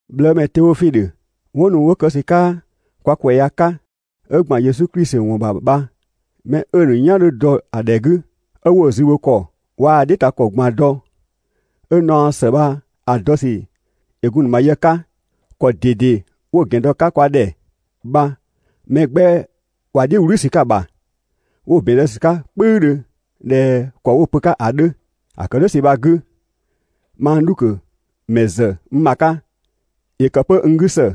꞊Bhlëëmɛ Teofidhö, 'wɔn ‑nu 'wo kë ‑sü 'ka kwa ‑kwɛ ya‑ 'ka 'ö ‑gban Yesu Klisi ‑wɔn ‑bha bha, 'mɛ 'ö‑ ‑nu "yan 'dhö dɔ‑ ‑dhɛ 'gü, 'ö 'wo‑ zü bho ‑kɔ waa‑ "dhiʋ̈ ‑ta ‑kɔ ꞊gban dɔ, 'ö naɔ ‑së bha‑ dɔ ‑sü ‑yö gun‑ ‑nu ‑bha yë 'ka, ‑kɔ ꞊dede 'wo‑ ‑gɛn dɔ‑ 'ka kwa ‑dhɛ bha mɛ 'gbɛ ‑wa "dhiʋ̈ "wlü ‑sü 'ka‑ ‑bha 'wo‑ ‑bɛn zë "kpʋ̈üdhö ꞊dhɛ ‑kɔ 'wo‑ pö‑ 'ka ‑a 'dhö. ‑A ‑kë "dhʋ̈ ‑sü bha‑ 'gü, mang Dhukö ‑mɛ ‑zë n ‑bha 'ka, ‑yö ‑kë 'pö n 'gü ‑së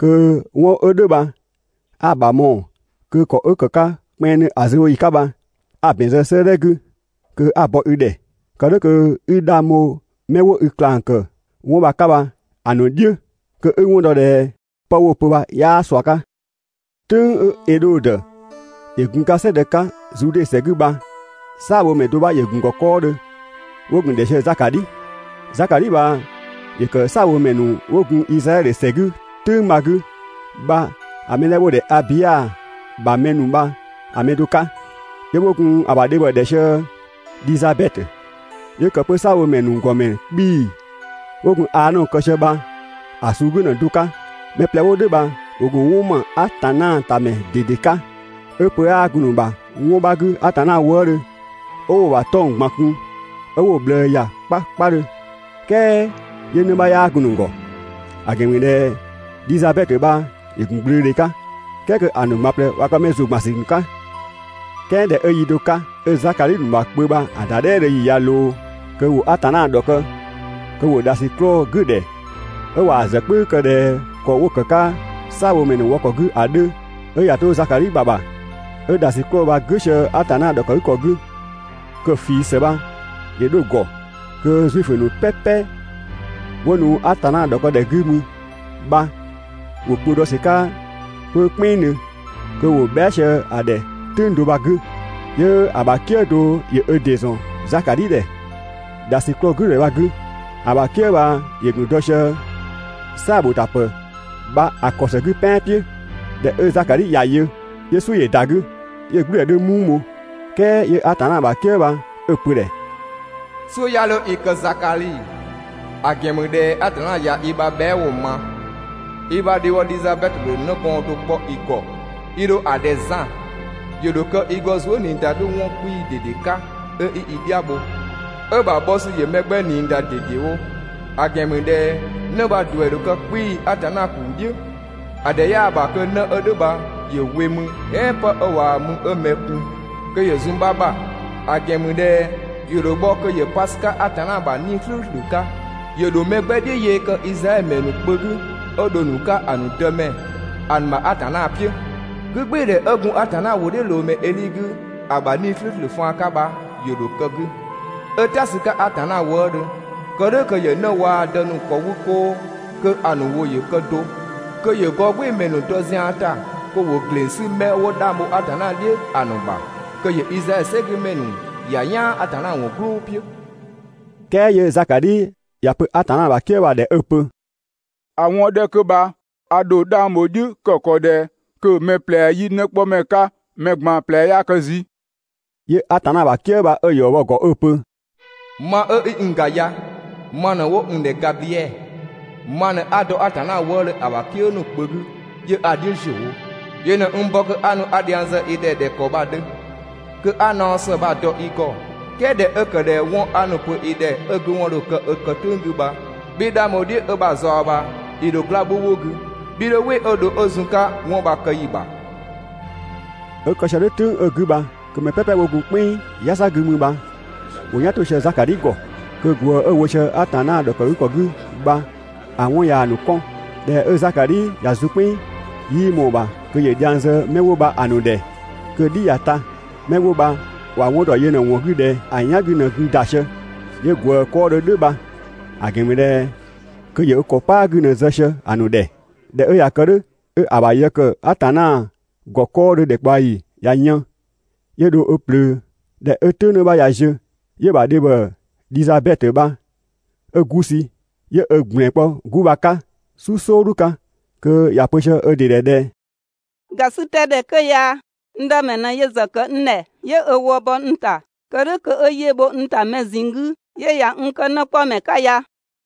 kö 'wɔn 'ö "dhʋ̈ bha 'a‑ ‑bha mɔɔ‑ kö ‑kɔ 'ö ‑kë 'ka kpɛnngdhö ‑a zübhoyi 'ka bha 'a‑ ‑bɛn zë 'sëëdhɛ 'gü kö 'a‑ bɔ i ‑dhɛ, kë "dhʋ̈ kö 'i 'dhang bho 'mɛ 'wo i ꞊klang ‑kë 'wɔn bha‑ 'ka bha‑ ‑nu "dhiʋ̈ kö 'i‑ 'wɔn dɔ ꞊dhɛ 'pë 'wo‑ pö bha 'yaa ꞊sua 'ka. "Tʋ̈ng 'ö Edhodö ‑yö gun‑ 'ka "sɛdë 'ka Zude ‑sɛ 'gü bha, "saabhomɛ do 'bha ‑yö gun‑ ‑gɔ 'kɔɔdhö 'wo gun‑ ‑dhɛ sië Zakadhi. Zakadhi bha ‑yö ‑kë "saabhomɛ ‑nu 'wo gun Izraɛdhö ‑sɛ 'gü "tʋ̈ng bha‑ 'gü bha‑ ‑nu kpö 'dhɛ 'wo‑ ‑dhɛ Abia ‑bha mɛ ‑nu bha ꞊në‑ mɛ do 'ka. 'Yö 'wo gun‑ ‑bha dhebhɔ ‑dhɛ sië Dhizabɛtö, 'yö ‑kë 'pö "saabhomɛ ‑nu ‑gɔmɛ 'kpii‑ 'wo gun‑ Aadhɔn kë sië bha‑ suu 'gü ‑në do 'ka. Mɛ ꞊plɛ 'wo "dhʋ̈ bha ‑wo ‑gun 'wɔn ‑ma Atanna ‑ta ‑mɛ ꞊dede 'ka, 'ö pö 'aa gun‑ ‑nu ‑bha 'wɔn 'bha 'gü Atanna wëëdhö, 'ö 'wo‑ ‑bha 'tɔng‑ ꞊gban kun 'ö 'wo‑ ꞊bhlëë ‑ya 'kpakpadhö. "Kɛɛ 'yö 'në 'bha 'yaa gun‑ ‑nu ‑gɔ, ‑a ‑gɛn ‑mü ꞊dhɛ Dhizabɛtö bha ‑yö ‑gun ꞊gblöödhe 'ka, "kɛɛ kö ‑a ‑nu ꞊gban ꞊plɛ ꞊wa kë mɛ ‑zʋgbansü ‑nu 'ka. "Kɛɛ ꞊dhɛ 'ö yi do 'ka, 'ö Zakadhi ‑nu ‑bha kpö bha‑ ‑da "dhɛɛdhö ‑yi ꞊ya ꞊loo kö ‑wo Atanna ‑dhɔkë, kö ‑wo ‑dhasiklɔɔ "gʋ̈‑ ‑dhɛ, 'ö ꞊waa‑ zë "kpʋ̈ü kë ꞊dhɛ ‑kɔ 'wo‑ ‑kë 'ka "saabhomɛ ‑nu wɔ ‑kɔ 'gü ‑a 'dhö, 'ö ꞊ya 'to Zakadhi ‑bha ‑bha, 'ö ‑dhasiklɔɔ bha‑ "gʋ̈ sië Atanna ‑dhɔkëgükɔ 'gü, kö‑ ꞊fii ‑së bha ‑yö 'dho‑ ‑gɔ, kö Zuifö ‑nu "pɛpɛ 'wo nu Atanna ‑dhɔkëdhɛ 'gü mü bha ‑wo kpö dɔ ‑sü 'ka 'pö "kpɛnngdhö kö ‑wo bhɛa" sië‑ ‑dhɛ "tʋ̈ng do bha‑ 'gü. 'Yö‑ ‑bha "kië do ‑yö ö ‑dɩ ‑zɔn Zakadhi ‑dhɛ ‑dhasiklɔɔ "gʋ̈ ‑dhɛ bha‑ 'gü. ‑A ‑bha "kië bha ‑yö ‑gun dɔ sië "saabhotapë bha‑ ‑kɔ ‑së 'gü "pɛan "piʋ̈. ꞊Dhɛ 'ö Zakadhi ‑ya yö, 'yö "suʋ̈ ‑yö ‑da 'gü, 'yö‑ "gblʋ̈ʋ̈dhɛ 'dhö "muu bho. "Kɛɛ 'yö Atanna ‑bha "kië bha 'ö‑ pö‑ ‑dhɛ: «"Suʋ̈ 'ya 'dho i kë, Zakadhi, ‑a ‑gɛn ‑mü ꞊dhɛ Atanna ꞊ya i ‑bha bhɛawʋ ma. I ‑bha dhebhɔ Dhizabɛtö ‑dho 'nëgɔɔn do 'kpɔ i ‑gɔ, i ‑dho ‑a ‑dhɛ Zan. ‑Yö ‑dho kë i ‑gɔ zuë" ꞊nii ‑da 'gü ‑wɔn 'kpii‑ ꞊dede 'ka 'ö 'i i "dhia bho, 'ö‑ ‑bha bhɔ ‑sü ‑yö mɛ 'gbɛ ꞊nii ‑da ꞊dedewo, ‑a ‑gɛn ‑mü ꞊dhɛ 'në bha‑ ‑duɛ ‑dho kë 'kpii‑ Atanna ‑kuu "dhiʋ̈, ‑a ‑dhɛ 'yaa‑ ‑bha kö 'në 'ö "dhʋ̈ bha ‑yö we mü "ɛɛn pë 'ö ꞊waa‑ mü 'ö mɛ kun kö ‑yö zun‑ 'bha ‑bha; ‑a ‑gɛn ‑mü ꞊dhɛ ‑yö ‑dho bhɔ kö ‑yö pa ‑sü 'ka Atanna ‑bha 'Nii‑ "slʋ̈ʋ̈slʋ̈ 'ka. ‑Yö ‑dho mɛ 'gbɛ "dhiʋ̈ yee kë Izraɛdhö ‑mɛ ‑nu kpö 'gü 'ö dho‑ ‑nu 'ka ‑a ‑nu Dëmɛ, ‑a ‑nu ‑bha Atanna "piʋ̈. 'Gügbɩɩdhɛ 'ö gun Atanna ‑wʋdhiʋ̈loomɛ Edhi 'gü ‑a ‑bha 'Nii‑ "slʋ̈ʋ̈slʋ̈ faan 'ka bha ‑yö ‑dho kë‑ 'gü, 'ö "ta sü‑ 'ka Atanna wëëdhö, kë "dhʋ̈ kö ‑yö 'në waa‑ dë nu ‑kɔ 'wü 'koo kö ‑a ‑nu ‑wʋ ‑yö kë do, 'kö ‑yö gɔɔgbɩɩmɛ ‑nu dɔ zian ‑ta kö ‑wo ‑gleng 'sü 'mɛ 'wo 'dhang bho Atanna "dhiʋ̈ ‑a ‑nu ‑bha, kö ‑yö Izraɛdhö ‑sɛgümɛ ‑nu ‑ya "yaan Atanna ‑wɔn "gblʋʋ "piʋ̈. "Kɛɛ 'yö Zakadhi ‑ya pö Atanna ‑bha "kië bha‑ ‑dhɛ 'ö‑ pö: «‑A 'wɔn 'dhɛ 'kö bha a ‑dho 'dhang bho‑ "dhiʋ̈ ‑kɔ kë ꞊dhɛ kö‑ mɛ ꞊plɛ 'yi‑ 'nëkpɔmɛ 'ka mɛ ꞊gban ꞊plɛ 'ya kë zii!» 'Yö Atanna ‑bha "kië bha 'ö‑ ‑yɔ bɔ‑ ‑gɔ 'ö‑ pö: «Ma 'ö i n ‑ga ya, ma ꞊në 'wo n ‑dhɛ Gabliɛ, ma ꞊në 'a dɔ Atanna wëëdhö ‑a ‑bha "kië ‑nu kpö 'gü 'yö 'a‑ "dhiʋ̈ ‑ziö wo, yö ꞊në n bɔ kö 'a nu 'a dhiang zë i ‑dhɛ ꞊dhɛ ‑kɔ bha‑ 'dhö, kö 'a naɔ ‑së bha‑ dɔ i ‑gɔ. "Kɛɛ ꞊dhɛ 'ö ‑kë ꞊dhɛ 'wɔn 'a nu‑ pö i ‑dhɛ 'ö‑ 'gü ‑wɔn ‑nu dho kë ö kë "tʋ̈ng 'gü bha, 'bhii 'dhang bho‑ "dhiʋ̈ 'ö bha‑ zaɔ bha, i ‑dho "gla "bhʋbhʋ 'gü, 'bhii 'dho "wɩ 'ö dho 'ö zun‑ 'ka 'wɔn bha‑ kë ‑yi ‑bha.» 'Ö kë sië "dhʋ̈ "tʋ̈ng 'ö‑ 'gü bha kö mɛ "pɛpɛ 'wo gun "kpɛnng "yasa 'gü mü bha ‑wo "yan 'to sië Zakadhi ‑gɔ, kö ꞊gwëë 'ö‑ wo sië Atanna ‑dhɔkëgükɔ 'gü bha‑ 'wɔn ꞊yaa‑ ‑nu 'kɔn. ꞊Dhɛ 'ö Zakadhi ꞊ya zun "kpɛnng, 'yii ꞊mɔɔ‑ ‑bha kö ‑yö dhiang zë 'mɛ 'wo bha‑ ‑nu ‑dhɛ kö‑ "dhi ꞊ya ta. 'Mɛ 'wo bha ‑wa 'wɔn ‑dɔ yö ꞊në‑ ‑wɔn 'gü ꞊dhɛ ‑a "yan 'gü ꞊në gun ‑da sië 'yö ꞊gwëë 'kɔɔdhö "dhʋ̈ bha, ‑a ‑gɛn ‑mü ꞊dhɛ kö ‑yö ö ‑kɔ "paa 'gü ꞊në zë sië‑ ‑nu ‑dhɛ. ꞊Dhɛ 'ö ꞊ya kë "dhʋ̈, 'ö‑ ‑bha yë ‑kë Atanna ‑gɔ 'kɔɔdhö ‑dhɛkpaɔyi ꞊ya yën, 'yö dho ö ꞊plöö. ꞊Dhɛ 'ö "tʋ̈ng 'në bha ꞊ya ziö, 'yö‑ ‑bha dhebhɔ Dhizabɛtö bha 'ö 'gu sü, 'yö ö ‑gblɛn kpɔ 'gu bha‑ 'ka "su "sɔɔdhu 'ka kö ‑ya pö sië ö ‑dɩ ‑dhɛ ꞊dhɛ: «‑Gasitɛ 'dhɛ 'kö ya n Dëmɛ ꞊në yö ‑zë ‑kë n ‑dhɛ, 'yö ö wë bɔ n ‑ta, kë "dhʋ̈ kö 'ö 'yiʋ̈‑ bho n ‑ta mɛ ꞊zinng 'gü ('yö ꞊ya n kë 'nëkpɔmɛ 'ka ya).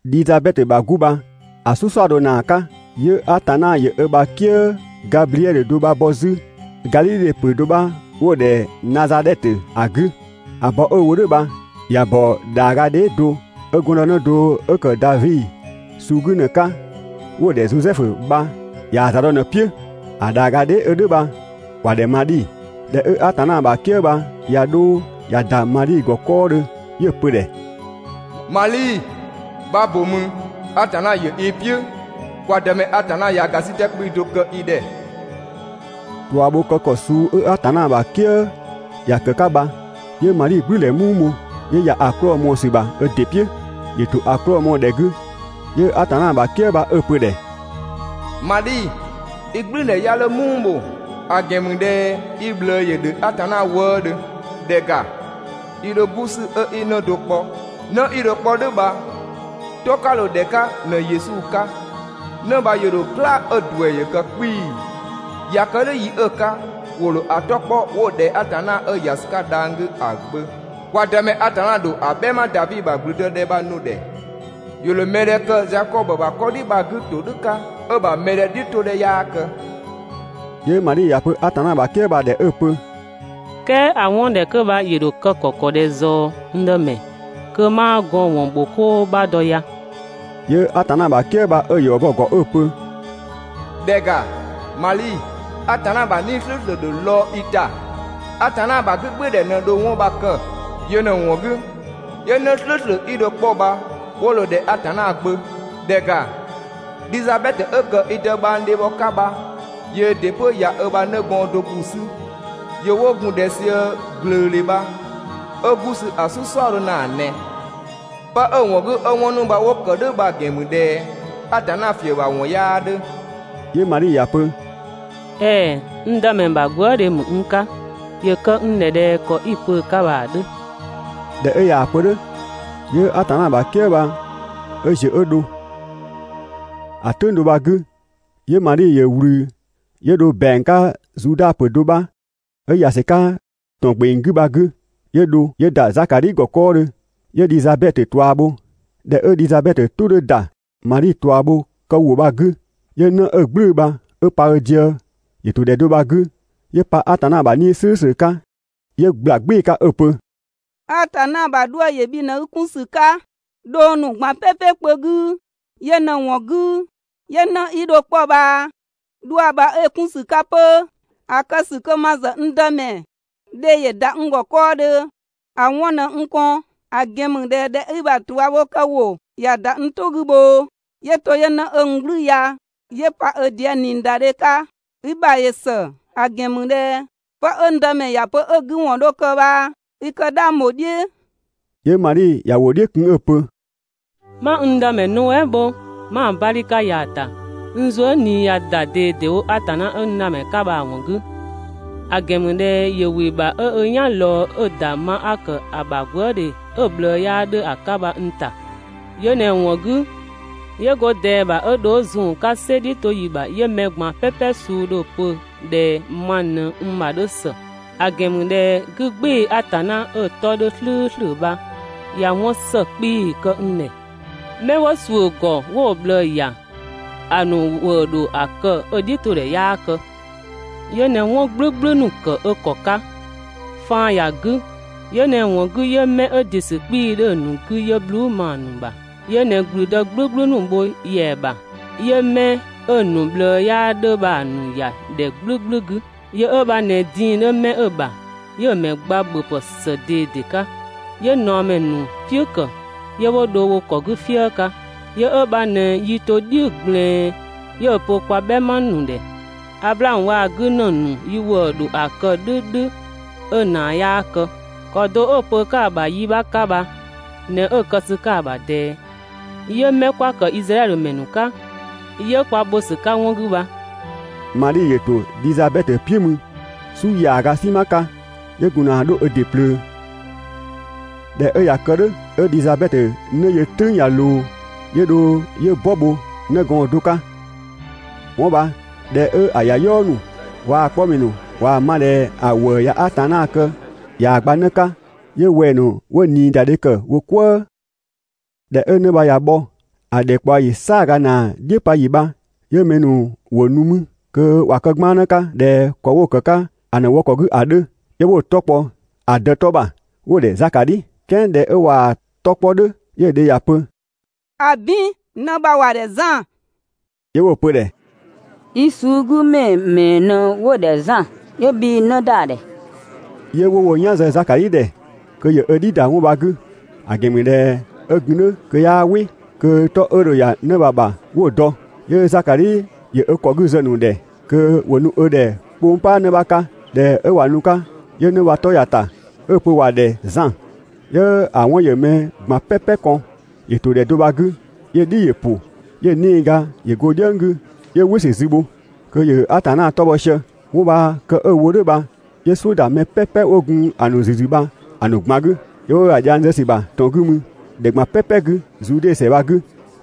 Dhizabɛtö ‑bha 'gu bha‑ "su "saɔdo ‑naa 'ka, 'yö Atanna ‑yö ö ‑bha "kië Gabliɛ do bha‑ bɔ 'zü Gadhidhe ‑pö do 'bha 'wo‑ ‑dhɛ Nazadhɛtö ‑a 'gü. ‑A bɔ 'ö‑ wo "dhʋ̈ bha ‑ya ‑bɔ ‑dhaagadhee do, 'ö gɔndënë do 'ö ‑kë Davi suu 'gü ꞊në‑ 'ka 'wo‑ ‑dhɛ Zosɛfu bha ꞊yaa‑ ‑za dɔ ꞊në‑ "piʋ̈. ‑A ‑dhaagadhee 'ö "dhʋ̈ bha ‑wa ‑dhɛ Madhi. ꞊Dhɛ 'ö Atanna ‑bha "kië bha ꞊ya 'dho ꞊ya ‑da Madhi ‑gɔ 'kɔɔdhö 'yö‑ pö‑ ‑dhɛ: «Madhi, 'bha ꞊boo mü,! Atanna ‑yö i "piʋ̈! Kwa Dëmɛ Atanna ꞊ya ‑gasitɛ 'kpii‑ do kë i ‑dhɛ!» ꞊Tua bho kë ‑kɔ suu 'ö Atanna ‑bha "kië ‑ya ‑kë 'ka bha 'yö Madhi "gblʋ̈ʋ̈dhɛ "muu bho, 'yö ‑ya ‑a 'klɔɔ‑ mɔɔ‑ ‑sü ‑bha ö ‑dɩ "piʋ̈. ‑Yö ‑to ‑a 'klɔɔ‑ mɔɔ‑ ‑dhɛ 'gü 'yö Atanna ‑bha "kië bha 'ö‑ pö‑ ‑dhɛ: «Madhi, i "gblʋ̈ʋ̈dhɛ 'ya 'dho "muu bho, ‑a ‑gɛn ‑mü ꞊dhɛ i ꞊bhlëë ‑yö ‑dhö Atanna wëëdhö. ‑Dhɛ ‑ga, i ‑dho 'gu sü 'ö 'i 'në do kpɔ. 'Në 'i dho‑ 'kpɔ "dhʋ̈ bha, 'tɔ 'ka dho‑ ‑dhɛ 'ka ꞊në Yesu 'ka. 'Në bha ‑yö ‑dho "gla 'ö‑ ‑duɛ ‑yö ‑kë 'kpii‑. ꞊Ya kë "dhʋ̈ yi 'ö‑ 'ka, ‑wo ‑dho ‑a 'tɔ kpɔ 'wo‑ ‑dhɛ Atanna 'ö ‑ya ‑sü 'ka dhang‑ 'gü ‑a Gbö. Kwa Dëmɛ Atanna ‑dho ‑a "bhɛma Davi ‑bha ‑gblüdëdhɛ bha‑ nu‑ ‑dhɛ. ‑Yö ‑dho mɛdhɛ kë Zakɔbö ‑bha 'kɔdhi bha‑ 'gü ‑todhʋ̈ 'ka 'ö‑ ‑bha mɛdhɛ "dhiʋ̈todhɛ 'yaa kë.» 'Yö Madhi ‑ya pö Atanna ‑bha "kië bha‑ ‑dhɛ 'ö‑ pö: «"Kɛɛ ‑a 'wɔn 'dhɛ 'kö bha ‑yö ‑dho kë ‑kɔ kë ꞊dhɛ ꞊zɔɔ, n Dëmɛ, kö 'maa gɔɔn‑ ‑wɔn ‑bhokoo 'bha dɔ ya!» 'Yö Atanna ‑bha "kië bha 'ö‑ ‑yɔ bɔ‑ ‑gɔ 'ö‑ pö: «‑Dhɛ ‑ga, Madhi, Atanna ‑bha 'Nii‑ "slʋ̈ʋ̈slʋ̈ ‑dho lɔɔ i ‑ta, Atanna ‑bha 'gügbɩɩdhɛ ꞊në dho 'wɔn bha‑ kë. Yö ꞊në‑ ‑wɔn 'gü, 'yö 'në "slʋ̈ʋ̈slʋ̈ 'i dho‑ kpɔ bha, 'wo dho‑ ‑dhɛ Atanna Gbö. ‑Dhɛ ‑ga, Dhizabɛtö 'ö ‑kë i dëbhang dhebhɔ 'ka bha, yöö ‑dɩ 'pö ꞊ya ö ‑bha 'nëgɔɔn do ‑gu 'sü. Yö 'wo gun‑ ‑dhɛ sië ꞊gblöödhe bha 'ö 'gu sü ‑a "su "saɔdo ‑naa ꞊nɛ. 'Pë 'ö‑ ‑wɔn 'gü 'yö 'wɔn ‑nu bha 'wo ‑kë "dhʋ̈ bha‑ ‑gɛn ‑mü ꞊dhɛ Atanna ‑fiëbhawɔn 'yaa 'dhö.» 'Yö Madhi ‑ya pö: «‑Ɛɛ, n Dëmɛ ‑bha gwëëdhe ‑mü n 'ka, ‑yö kë n ‑dhɛ ꞊dhɛ ‑kɔ 'i‑ pö‑ 'ka bha‑ 'dhö!» ꞊Dhɛ 'ö ꞊yaa‑ pö "dhʋ̈, 'yö Atanna ‑bha "kië bha 'ö ziö 'ö dho. ‑A "tʋ̈ng do bha‑ 'gü, 'yö Madhi ‑yö ꞊wlü 'yö dho ‑bɛang 'ka Zuda ‑pö do 'bha 'ö ‑ya ‑sü 'ka ‑tɔn ‑gbeng 'gü bha‑ 'gü, 'yö dho 'yö ‑da Zakadhi ‑gɔ 'kɔɔdhö 'yö Dhizabɛtö ꞊tua bho. ꞊Dhɛ 'ö Dhizabɛtö "tʋ 'dhö ‑da Madhi ꞊tua bho kë ‑wʋ bha‑ 'gü, 'yö 'në 'ö‑ "gblʋ̈ʋ̈‑ bha 'ö pa ö diëë 'ka. 'Yö to ‑dhɛ do bha‑ 'gü 'yö pa Atanna ‑bha 'Nii‑ "slʋ̈ʋ̈slʋ̈ 'ka, 'yö ꞊gbla "gbɩɩ‑ 'ka 'ö‑ pö: «Atanna ‑bha 'dhuë‑ ‑yö bhi ꞊në i 'kun ‑sü 'ka dhong‑ ‑nu ꞊gban "pɛpɛ kpö 'gü, yö ꞊në‑ ‑wɔn 'gü 'yö 'në 'i dho‑ 'kpɔ bha 'dhuë‑ bha 'ö‑ 'kun ‑sü 'ka 'pö. ‑A kë ‑sü kö ma ‑zë n Dëmɛ dhe ‑yö ‑da n ‑gɔ 'kɔɔdhö, ‑a 'wɔn ꞊në n kɔn! ‑A ‑gɛn ‑mü ꞊dhɛ ꞊dhɛ 'ö i ‑bha ꞊tua bho kë ‑wʋ ꞊ya ‑da n "tʋ 'gü bhoo, 'yö to 'yö 'në 'ö n "gblʋ̈ʋ̈‑ ya 'ö pa ö diëë ꞊niidadhe 'ka. I ‑bha ‑yö ‑së! ‑A ‑gɛn ‑mü ꞊dhɛ 'pë 'ö n Dëmɛ ‑ya pö 'ö‑ 'gü ‑wɔn dho kë bha i ka 'dhang bho‑ "dhiʋ̈.» 'Yö Madhi ‑ya ‑wʋ "dhiʋ̈ kun 'ö‑ pö: «'Ma n Dëmɛ nuɛ" bho, 'ma‑ 'badhika ‑ya ‑ta. N zuë" ꞊nii ꞊ya ‑da ꞊dedewo Atanna 'ö n Dhamɛ 'ka bha‑ ‑wɔn 'gü. ‑A ‑gɛn ‑mü ꞊dhɛ ‑yö ‑wɩ ‑bha 'ö ö "yan ꞊lɔɔ 'ö‑ ‑da ma 'a ‑kë ‑a ‑bha gwëëdhe 'ö‑ ꞊bhlëë 'yaa 'dhö ‑a 'ka bha n ‑ta. Yö ꞊në‑ ‑wɔn 'gü, 'yö go ꞊dɛɛ ‑bha 'ö dho 'ö zun‑ 'ka "sɛ "dhiʋ̈toyi ‑bha 'yö mɛ ꞊gban "pɛpɛ suu dho‑ pö ꞊dhɛ ma ꞊në n ‑bha 'dhö ‑së. ‑A ‑gɛn ‑mü ꞊dhɛ 'gügbɩɩ Atanna 'ö‑ 'tɔ 'dhö "slʋ̈ʋ̈slʋ̈ bha, ꞊ya 'wɔn ‑së 'kpii‑ kë n ‑dhɛ. 'Mɛ 'wo ‑suʋ̈ ‑gɔ 'wo‑ ꞊bhlëë ‑ya, ‑a ‑nu ‑wëë ‑dho ‑a kë 'ö‑ "dhiʋ̈todhɛ 'yaa kë. Yö ꞊në 'wɔn "gblʋ̈gblʋ̈ ‑nu ‑kë ö ‑kɔ 'ka, faan ‑ya 'gü. Yö ꞊në‑ ‑wɔn 'gü 'yö 'mɛ 'ö ‑dɩ ‑sü 'kpii‑ 'dhö‑ ‑nu 'gü 'yö bhluu" ma‑ ‑nu ‑bha. Yö ꞊në ‑gblüdë "gblʋ̈gblʋ̈ ‑nu bho ‑yɛa ‑bha. 'Yö 'mɛ 'ö‑ ‑nu ꞊bhlëë 'yaa 'dhö bha‑ ‑nu ‑ya ‑dhɛ "gblʋ̈gblʋ̈ 'gü. Yö 'ö bha ꞊në din‑ 'dhö 'mɛ 'ö‑ ‑bha, 'yö‑ ‑mɛ gba ‑bhöpë ‑së ꞊dede 'ka, 'yö ꞊naɔmɛ ‑nu "piʋ̈ ‑kë, 'yö 'wo dho wo ‑kɔ 'gü "fië 'ka. Yö 'ö bha ꞊në‑ yi to "dhiʋ̈ ꞊gblɛɛn, 'yö‑ pö kwa "bhɛma ‑nu ‑dhɛ Ablaamö waa‑ 'gü ‑në ‑nu yi ‑wëë ‑dho ‑a kë "dhʋ̈ "dhʋ̈ 'ö‑ ‑naa 'yaa kë. ‑Kɔ do 'ö‑ pö‑ 'ka‑ ‑bha yi 'bha 'ka bha ꞊në 'ö‑ kë ‑sü 'ka‑ ‑bha ꞊dɛɛ, 'yö 'mɛ 'kwa ‑kë Izraɛdhö ‑mɛ ‑nu 'ka, 'yö kwa bho ‑sü 'ka 'wɔn 'gü bha.» Madhi ‑yö ‑to Dhizabɛtö "piʋ̈ mü "su ‑yaaga "sinma 'ka 'yö gun ‑na 'dho ö ‑dɩ ꞊plöö. ꞊Dhɛ 'ö ꞊ya kë "dhʋ̈ 'ö Dhizabɛtö 'në yö "tʋ̈ng ꞊ya ꞊loo, 'yö dho 'yö "bɔ bho 'nëgɔɔn do 'ka. 'Wɔn bha ꞊dhɛ 'ö‑ ‑yayɔɔ ‑nu waa‑ 'kpɔmɛ ‑nu ꞊waa‑ ma ꞊dhɛ ‑a ‑wëë ꞊ya Atanna kë ꞊yaa‑ gba 'në 'ka, 'yö ꞊wɛnng ‑nu 'wo‑ ꞊niidadhe ‑kë wo "kwëë. ꞊Dhɛ 'ö 'në bha ꞊ya bhɔ, ‑a ‑dhɛkpaɔyi "saaga ‑naa "dhiʋ̈ pa ‑yi bha, 'yö mɛ ‑nu ‑wo nu mü kö ‑wa kë 'gbannë 'ka ꞊dhɛ ‑kɔ 'wo‑ ‑kë 'ka ‑a ‑nu wɔ ‑kɔ 'gü ‑a 'dhö. 'Yö 'wo‑ 'tɔ kpɔ‑ dë 'tɔ ‑bha 'wo‑ ‑dhɛ Zakadhi. "Kɛɛ ꞊dhɛ 'ö ꞊waa‑ 'tɔ kpɔ "dhʋ̈, 'yö‑ dhe ‑ya pö: «‑Abin! 'Në bha ‑wa ‑dhɛ Zan.» 'Yö 'wo‑ pö‑ ‑dhɛ: «I suu 'gü ‑mɛ ‑mɛɛ ꞊në 'wo‑ ‑dhɛ Zan, 'yö bhii 'në ‑da ‑dhɛ.» 'Yö 'wo wo "yan zë Zakadhi ‑dhɛ kë "dhʋ̈ kö ‑yö ö "dhi ‑da 'wɔn bha‑ 'gü (‑a ‑gɛn ‑mü ꞊dhɛ 'ö gun "dhʋ̈ kö 'yaa "wɩ), kö 'tɔ 'ö dho‑ ‑ya 'në bha‑ ‑bha 'wo‑ dɔ. 'Yö Zakadhi ‑yö ö ‑kɔ 'gü zë‑ ‑nu ‑dhɛ kö ‑wo nu ö ‑dhɛ 'kpongpaa 'në 'bha 'ka. ꞊Dhɛ 'ö ꞊wa nu‑ 'ka 'yö 'në bha‑ 'tɔ ‑ya ‑ta 'ö‑ pö ‑wa ‑dhɛ Zan. 'Yö‑ 'wɔn ‑yö mɛ ꞊gban "pɛpɛ kɔn. ‑Yö ‑to ‑dhɛ do bha‑ 'gü, 'yö‑ "dhi ‑yö ‑pʋ, 'yö‑ 'nɛɛga ‑yö go‑ "dhiëng 'gü 'yö "wɩ ‑sü zü bho, kö ‑yö Atanna 'tɔ bhɔ sië. 'Wɔn bha kë 'ö‑ wo "dhʋ̈ bha, 'yö "suʋ̈ ‑da mɛ "pɛpɛ 'wo gun‑ ‑nu ‑züzü bha‑ ‑nu ꞊gban 'gü, 'yö 'wo ‑ya ‑dhiang zë ‑sü ‑bha ‑tɔn 'gü mü ‑dhɛ ꞊gban "pɛpɛ 'gü Zude ‑sɛ bha‑ 'gü.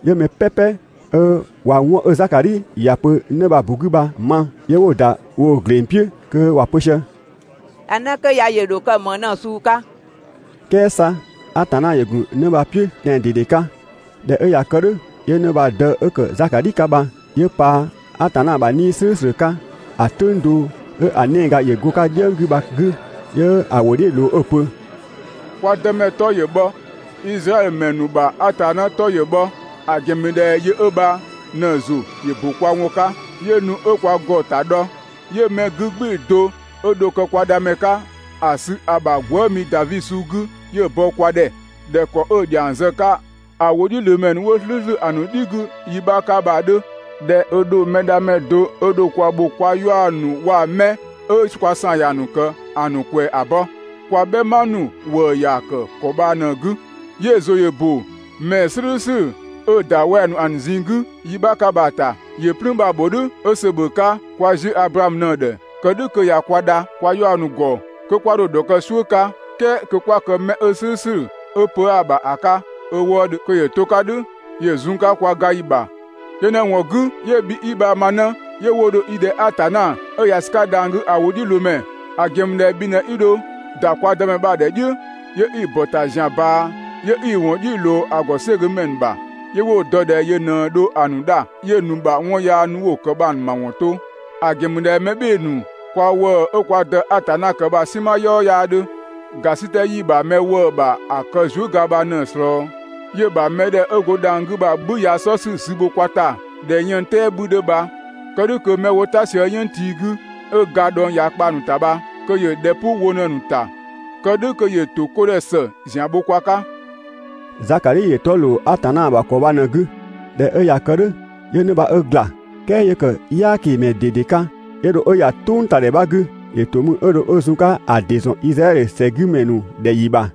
'Yö mɛ "pɛpɛ 'ö ꞊wa 'wɔn 'ö Zakadhi ‑ya pö 'në bha‑ ‑bu 'gü bha‑ ma, 'yö 'wo‑ ‑da woo‑ ‑gleng "piʋ̈ kö ‑wa pö sië: «‑A 'në 'kö ya ‑yö ‑dho kë ‑më ꞊në‑ suu 'ka?» "Kɛɛ 'sa Atanna ‑yö gun 'në bha‑ "piʋ̈ tɛan‑ ꞊dede 'ka. ꞊Dhɛ 'ö ꞊ya kë "dhʋ̈, 'yö 'në bha‑ dë 'ö ‑kë Zakadhi 'ka bha, 'yö pa Atanna ‑bha 'Nii‑ "slʋ̈ʋ̈slʋ̈ 'ka ‑a "tʋ̈ng do 'ö‑ ɔngyaa ga ‑yö go‑ 'ka‑ "dhiëng 'gü bha‑ 'gü, 'yö‑ ‑wʋ "dhiʋ̈ ꞊loo 'ö‑ pö: «Kwa Dëmɛ 'tɔ ‑yö bhɔ, Izraɛdhö ‑mɛ ‑nu ‑bha Atanna 'tɔ ‑yö ‑bhɔ, ‑a ‑gɛn ‑mü ꞊dhɛ yö 'ö bha ꞊në‑ ‑zʋ ‑yö ‑bö kwa ‑wɔn 'ka, 'yö nu 'ö kwa ‑gɔ ‑ta dhɔ. 'Yö mɛ 'gügbɩɩ do 'ö dho kë kwa Dhamɛ 'ka, ‑a sü ‑a ‑bha gwëëmi Davi suu 'gü 'yö‑ bɔ kwa ‑dhɛ ꞊dhɛ ‑kɔ 'ö‑ ‑dhiang zë‑ 'ka, ‑a ‑wʋdhiʋ̈loomɛ ‑nu 'wo "slʋ̈ʋ̈slʋ̈ ‑a ‑nu "dhi 'gü yi 'bha 'ka bha‑ 'dhö, ꞊dhɛ ö ‑dho Mɛdhamɛ do 'ö dho kwa bho kwa 'yaɔ‑ ‑nu waa‑ 'mɛ 'ö kwa ‑san ‑ya ‑nu ‑kë ‑a ‑nu ꞊kwɛɛ‑ ‑a bɔ. Kwa "bhɛma ‑nu ‑wëë ‑ya ‑kë ‑kɔ bha ꞊në‑ 'gü, 'yö‑ ‑zʋ ‑yö ‑bö ‑mlɛɛ "slʋ̈ʋ̈slʋ̈ 'ö‑ ‑da wɛng‑ ‑nu ‑a ‑nu ꞊zinng 'gü yi bha‑ 'ka bha‑ ‑ta, ‑yö "plüün bha‑ ‑bho "dhʋ̈ 'ö ‑sö ‑bhö 'ka kwa 'ziʋ̈‑ Ablaamö ꞊në‑ ‑dhɛ. Kë "dhʋ̈ kö 'ya kwa dha kwa 'yaɔ‑ ‑nu ‑gɔ kö 'kwa 'dho‑ ‑dhɔkë "suʋ̈ 'ka, "kɛɛ kö 'kwa kë mɛ 'ö "slʋ̈ʋ̈slʋ̈ 'ö pö 'aa‑ ‑bha ‑a 'ka ö wëëdhö kö ‑yö 'to‑ 'ka "dhʋ̈ ‑yö zun‑ 'ka kwa ga ‑yi ‑bha. 'Yö ꞊në‑ ‑wɔn 'gü, 'yö bhi 'i bha ma 'në, 'yö 'wo dho i ‑dhɛ Atanna 'ö ‑ya ‑sü 'ka dhang‑ 'gü ‑a ‑wʋdhiʋ̈loomɛ; ‑a ‑gɛn ‑mü ꞊dhɛ bhi ꞊në 'i dho ‑da kwa Dëmɛ bha‑ ‑dhɛ "dhiʋ̈, 'yö 'i‑ ‑bɔ ‑ta ‑zian ꞊baa, 'yö 'i‑ ‑wɔn "dhiʋ̈ ꞊loo‑ ‑gɔ "sɛgümɛ ‑nu ‑bha 'yö 'wo‑ dɔ ꞊dhɛ yö ꞊në dho‑ ‑nu dha, 'yö‑ ‑nu ‑bha 'wɔn yaa ‑nu 'wo‑ ‑kë bha‑ ‑nu ‑mawɔn to. ‑A ‑gɛn ‑mü ꞊dhɛ mɛ "bhɩɩ‑ ‑nu kwa ‑wëë 'ö kwa Dë Atanna ‑kë bha‑ "sinma "yɔɔ 'yaa 'dhö, ‑gasitɛ 'yii‑ ‑bha mɛ ‑wëë ‑bha ‑a kë zuëga bha ꞊në‑ ꞊slɔɔ, 'yö‑ ‑bha mɛdhɛ 'ö go dhang‑ 'gü bha‑ 'bhü ꞊ya 'sɔ ‑sü zü bho kwa ‑ta ꞊dhɛ 'yënng‑ "tɛɛ 'bhü 'dhö bha, kë "dhʋ̈ kö 'mɛ 'wo "ta sië "yënng tii 'gü, 'ö ga dhɔng ꞊ya kpa ‑nu ‑ta bha, kö ‑yö ‑dhɛ "pʋ wo ꞊në‑ ‑nu ‑ta, kë "dhʋ̈ kö ‑yö ‑to 'ko ‑dhɛ ‑së ‑zian bho kwa 'ka.» Zakadhi ‑yö 'tɔ ‑loo Atanna ‑bha ‑kɔ bha ꞊në‑ 'gü. ꞊Dhɛ 'ö ꞊ya kë "dhʋ̈ 'yö 'në bha 'ö ‑gla, "kɛɛ 'yö kë "yaakimɛ ꞊dede 'ka, 'yö dho 'ö ‑ya "tʋngtadhɛ 'bha 'gü, 'yö to 'mü 'ö dho 'ö zun‑ 'ka ‑a ‑dɩ ‑zɔn Izraɛdhö ‑sɛgümɛ ‑nu ‑dhɛ ‑yi ‑bha.